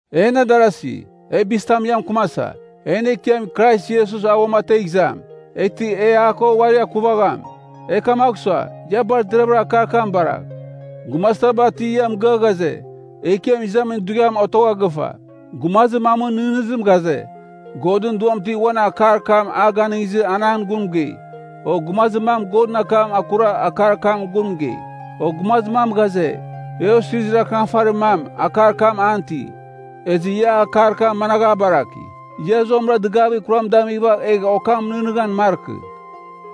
En adarasi, e bizitam ia mɨkɨmasa, en Ekiam Krais Iesus a uamategh izam, eghtɨ e a ko uari akuvagham. E kamagh sua, ia bar deravɨra akar kam baragh. Gumazir taba ti ia mɨgɨa ghaze, Ekiam Izamin Dughiam otogha gɨfa. Gumazir mamɨn nɨghnɨzim ghaze, Godɨn Duam ti uan akar kam a ganɨngizɨ an an gun mɨgei. O gumazir mam Godɨn akam akura akar kam gun mɨgei. O gumazir mam ghaze, e osirizir akɨnafarir mam, akar kam an iti. Ezɨ ia akar kam managh a baraki, ia zuamɨra dɨgavir kuram damighɨva egh okam nɨghnɨghan markɨ.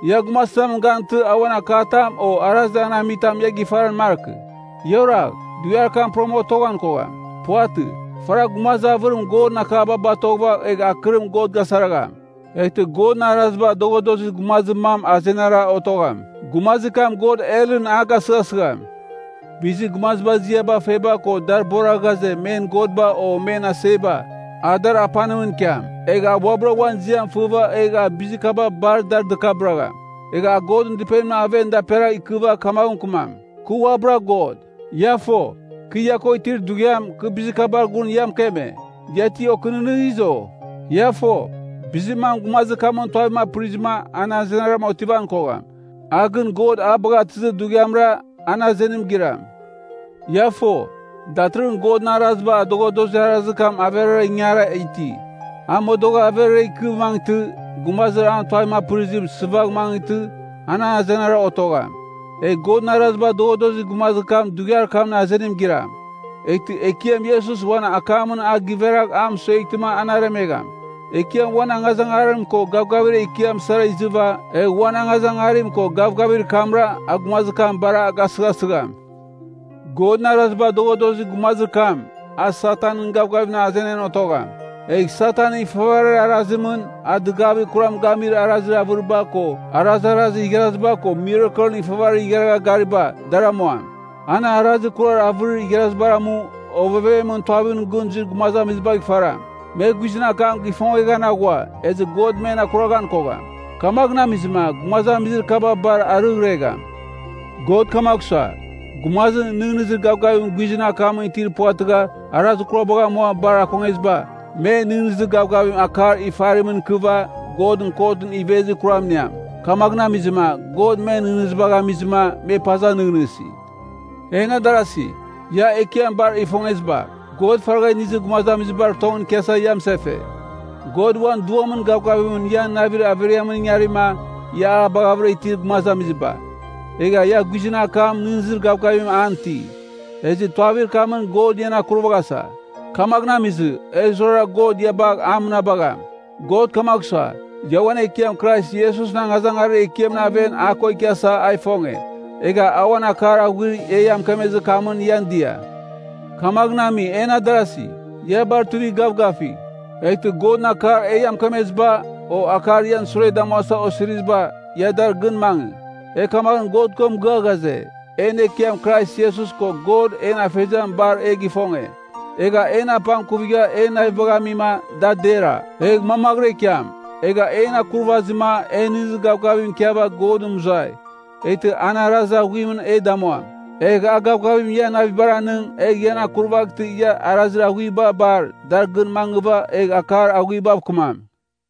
Ia gumazitamɨn gantɨ a uan akatam o arazir an amitamɨn ia gifaran markɨ. Ia oragh! Dughiar kam puram otoghan kogham. Puvatɨ. Faragh gumazir avɨrim Godɨn akaba batoghɨva egh akɨrim God gasaragham. Eghtɨ Godɨn araziba adoghadozir gumazir mam azenara otogham, gumazir kam God helɨn a gasɨghasɨgham. Bizir gumaziba ziaba feba ko dar bora ghaze men godba o men aseba, a dar apanimɨn ikiam. Egh a uabɨra uan ziam fɨva egh a bizir kaba bar da dɨkabɨragham. Egh a Godɨn Dɨpenimɨn aven daperagh ikɨva kamaghɨn mɨkɨmam, “Kɨ uabɨra God.” Ia fo, kɨ ia ko itir dughiam, kɨ bizir kabar gun ia mɨkeme. Ia ti okɨnɨghnɨghiz, o? Ia fo, bizir mam gumazir kamɨn tuavim apɨrima an azenaram otivan kogham. A gɨn God a bagha atɨzir dughiamra, an azenim giram. Ia fo, datɨrɨghɨn Godɨn araziba adoghadozir arazir kam averara ingari iti. A modogh averara ikɨ mangɨtɨ, gumazir an tuavim apɨrizim, sɨvagh mangɨtɨ, an azenaram otogham. Egh Godɨn araziba adoghadozir gumazir kam dughiar kamɨn azenim giram. Eghtɨ Ekiam Iesus uan akamɨn a giveragh a mɨsueghtɨma an aremegham. Ekiam uan angazangarim ko gavgavir ekiam sara izɨva, egh uan angazangarim ko gavgavir kamra a gumazir kam bar a gasɨghasɨgham. Godɨn araziba adoghadozir gumazir kam, a Satanɨn gavgavimɨn azenan otogham. Egh Satanɨn ifavarir arazimɨn, a dɨgavir kuram gamir arazir avɨriba ko arazarazir igharaziba ko mirakelɨn ifavarir igharagha gariba, dar amuam. An arazir kurar avɨrir igharazibar amu, ovevemɨn tuavimɨn gɨn zuir gumazibagh ifaram. Me guizɨn akam gifongeghan aghua, ezɨ God men akuraghan kogham. Kamaghɨn amizɨma, gumazamizir kaba bar arɨghregham. God kamagh sua, gumazir nɨghnɨzir gavgavim guizɨn akamɨn itir puvatɨgha arazir kurabagh amua bar akongeziba, me nɨghnɨzir gavgavim akar ifarimɨn ikɨva, Godɨn kotɨn ivezir kuram iniam. Kamaghɨn amizɨma, God men nɨghnɨzibagh amizɨma, me paza nɨghnɨsi. En darasi, ia Ekiam bar ifongeziba, God faragha inizir gumazamizibar tongɨn ikiasa ia mɨsefe. God uan Duamɨn gavgavimɨn ian navir averiamɨn ingarima, ia a baghavɨra itir gumazamiziba, egha ia guizɨn akam nɨghnɨzir gavgavim an iti. Ezɨ tuavir kamɨn God ian akurvaghasa. Kamaghɨn amizɨ, e zurara God ia bagh a mɨnabagham. God kamagh sua, ia uan Ekiam Krais Iesusɨn angazangarir ekiamɨn aven a ko ikiasa a ifonge. Egha a uan akar aghuir e ia mɨkemezir kamɨn ian dia. Kamaghɨn ami, en adarasi, ia bar tuivigh gavgafigh. Eghtɨ Godɨn akar e ia mɨkemeziba, o akar ian sure damuasa osiriziba, ia dar gɨn mangɨ. E kamaghɨn God ko mɨgɨa ghaze, en Ekiam Krais Iesus ko God en Afeziam bar e gifonge. Egha en apangkuvigha en navibagh amima, da dera, egh mamaghɨra ikiam. Egha en akurvazima en nɨghnɨzir gavgavim ikiava Godɨn mɨzuai, eghtɨ an arazir aghuimɨn e damuam. Egh a gavgavim ian navibar anɨng, egh ian akurvaghtɨ ia arazir aghuiba bar, dar gɨn mangɨva egh akar aghuibav kɨmam.